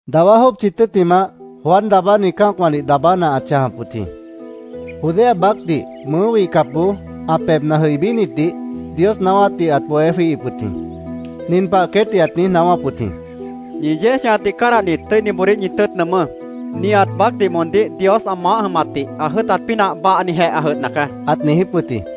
Dawá jópchi tʉ́ttimah, Juan Daabáni cã́acwãdih daabána ãt chãjap wʉt jĩ. Judea baácdih mʉʉ́ wihcapboó ã pebhna jʉibínitdih Dios naáwátdih ãt bohé jwíihip wʉt jĩ. Nin pah queétdih ãt niíj naáwáp wʉt jĩ: “¡Ñi yéej chãjatdih cádahnit, tʉ́iniboodíh ñi tʉ́ʉt nʉʉmʉ́! Nihat baácdih moondíh Dios ã maáh jʉmatdih ã jʉ́ʉtat pínah bahnijeh ã jʉdhna caá”, ãt niijíp wʉt jĩ.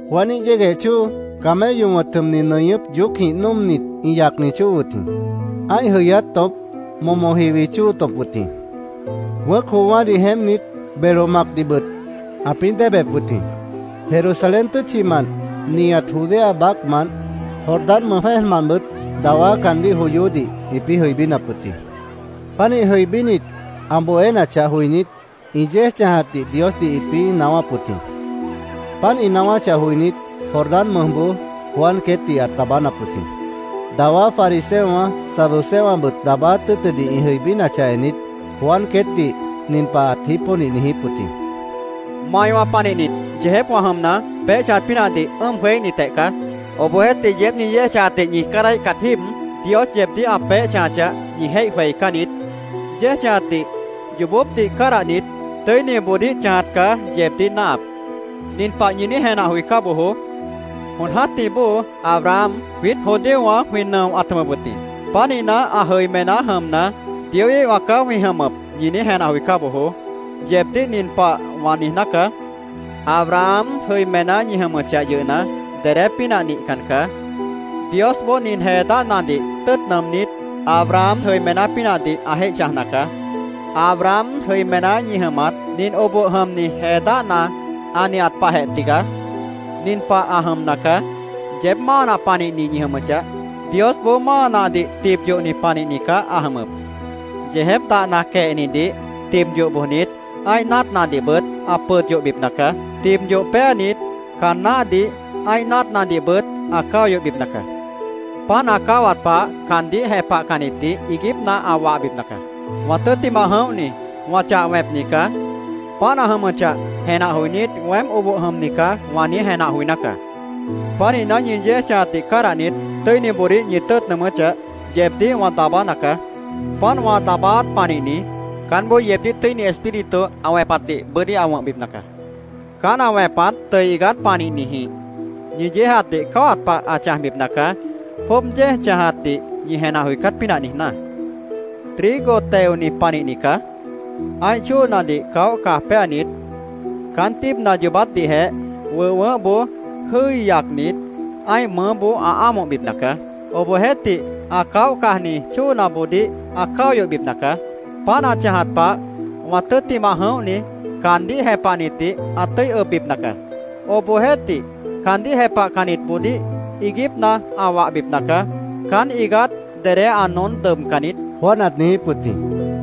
Juaníh yégueh chóo camello wʉ̃t jʉmni nʉñʉ́p yoócjĩh nóomnit, ĩ yacni chóo wʉt jĩ. Ã́ih jʉyáát tõp momo jiwi chóo tõp wʉt jĩ. Wʉ̃ʉ́c joowã́dih jeémpnit, belo macdihbʉt ãpĩ́ déebep wʉt jĩ. Jerusalén tʉ́tchimant, nihat Judea baácmant, Jordán mʉj jwẽ́ejmantbʉt dawá caandíh joyódih ĩpĩ́ jʉibínap wʉt jĩ. Pánih jʉibínit, ã bohénachah joinít, ĩ yéej chãjatdih Diosdih ĩpĩ́ naáwáp wʉt jĩ. Páant ĩ naáwáchah joinít, Jordán mʉjboó Juan queétdih ãt daabánap wʉt jĩ. Dawá fariseowã, saduceowãbʉt daabáát tʉ́ʉtʉdih ĩ jʉibínachah ennit, Juan queétdih nin pah ãt jípónih niijíp wʉt jĩ: “¡Maiwã panihnit yeejépwã jʉmna, peéh chãjat pínahdih ʉ́ʉm jweííhnitjeh caá! Obohjeéhtih, yeéb ñi yéej chãjatdih ñi cádahíhcat jíib Dios yeebdíh ã peéh chãjachah, ñi jéih jweicán niít. Yéej chãjatdih yoobópdih cádahnit, tʉ́iniboodíh chãjat caá yeebdíh náahap. Nin pah ñi niíj jenah joicá bojoó: ‘Jon jã́tih bóo Abraham jwiít judíowã jwĩ nʉo ãt jʉmʉp wʉt jĩ. Pánihna, ã jʉimená jʉmna, Dioíhwã caá jwĩ jʉmʉp’, ñi niíj jenah joicá bojoó. Yeebdíh nin pah wã niijná caá: Abraham jʉimená ñi jʉmʉchah yʉhna, dedé pínah nihcan caá. Diosboó nin jee dáhnadih tʉ́ʉt nʉʉmnít, Abraham jʉimená pínahdih ã jéih chãjna caá. Abraham jʉimená ñi jʉmat nin oboh jʉmni jee dáhna ã nihat pahjeh tigaá. Nin pah ã jʉmna caá: Yeéb máa nah panihni ñi jʉmʉchah, Diosboó máa nahdih tib yohni panihni caá ã jʉmʉp. Yeejép dahna quehnidih tib yoh bojnit, ã́ih náatnadihbʉt ã pʉd yohbipna caá. Tib yoh péanit, caan náhdih, ã́ih náatnadihbʉt ã cáo yohbipna caá. Páant ã cáwat pah caandíh jepahcannitdih iiguípna ã wahbipna caá. Wã tʉ́ttimah jʉ̃óhni wã chah wẽpni caá. Páant ã jʉmʉchah jenah joinít, ‘Weém oboh jʉmni caá’, wã niíj jenah joiná caá. Pánihna, ñi yéej chãjatdih cádahnit, tʉ́iniboodíh ñi tʉ́ʉt nʉʉmʉ́chah, yeebdíh wã daabána caá. Páant wã daabáát panihni, caánboó yeebdíh Tʉ́ini Espíritu ã wẽpatdih bʉ́dí ã wʉ̃hbipna caá. Caán ã wẽpat tʉʉ iigát panihnijĩh ñi yéejatdih cáwat pah ã chãjbipna caá, jwʉ́ʉb yéej chãjíhatdih ñi jenah joicát pínah niijná. Trigo teoni panihni caá. Ã́ih chóonadih caóh caj péanit, caán tíibna yoobátdihjeh wʉh wʉʉ́hboó jʉ́i yacnit, ã́ih mʉʉ́boó ã ámohbipna caá. Obohjeéhtih, ã caóh cajni chóonaboodíh ã cáo yohbipna caá. Páant ã chãjat pah wã tʉ́ttimah jʉ̃óhni caandíh jepahnitdih ã tʉ́i ʉbbipna caá. Obohjeéhtih, caandíh jepahcannitboodíh iiguípna ã wahbipna caá. Caán iigát dedé ã noón dʉbcan niít”, Juan ãt niijíp wʉt jĩ.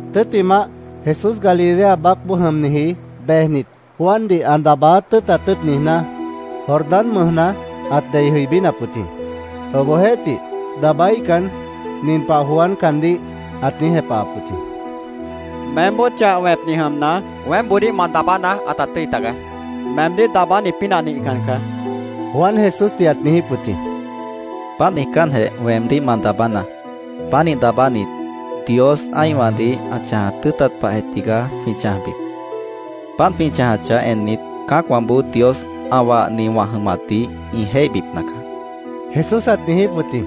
Tʉ́ttimah, Jesús Galilea baácboó jʉmniji bejnit, Juandih ã daabáát tʉ́ʉtat tʉ́ʉt niijná, Jordán mʉjna ãt dei jʉibínap wʉt jĩ. Obohjeéhtih, daabáíhcan, nin pah Juan caandíh ãt niíj jepahap wʉt jĩ: —Meémboó chah wẽpni jʉmna, weémboodíh ma daabána ãta tʉ́i tagaá. Meemdíh daabáni pínah nihcan caá, Juan Jesúsdih ãt niijíp wʉt jĩ. —Páant niijcánjeh, weemdíh ma daabánaá. Pánih daabánit, Dios ã́ihwãdih ã chãjat tʉ́ʉtat pahjeh tigaá jwĩ chãjbip. Páant jwĩ chãjachah ennit, cã́acwãboó Dios ã wahni wã jʉmatdih ĩ jéihbipna caá, Jesús ãt niijíp wʉt jĩ.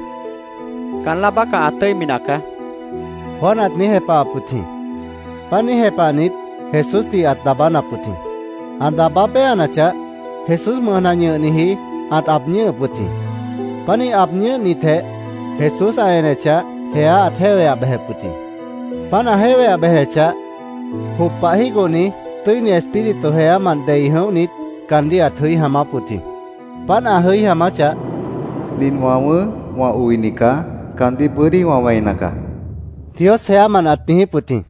—Caán láa bácah, ã tʉ́imi nacaá, Juan ãt niíj jepahap wʉt jĩ. Páant niíj jepahnit, Jesúsdih ãt daabánap wʉt jĩ. Ã daabá péanachah, Jesús mʉjna ñʉhniji ãt aab ñʉ́hʉp wʉt jĩ. Pánih aab ñʉ́hnitjeh, Jesús ã enechah, jeá ãt jéweah bejep wʉt jĩ. Páant ã jéweah bejechah, jop pah jígohni Tʉ́ini Espíritu jeámant dei jʉ̃óhnit, caandíh ãt jʉí jaamáp wʉt jĩ. Páant ã jʉí jaamáchah, “Nin wã wʉ̃ʉ́h, wã oini caá. Caandíh bʉ́dí wã wẽina caá”, Dios jeámant ãt niijíp wʉt jĩ.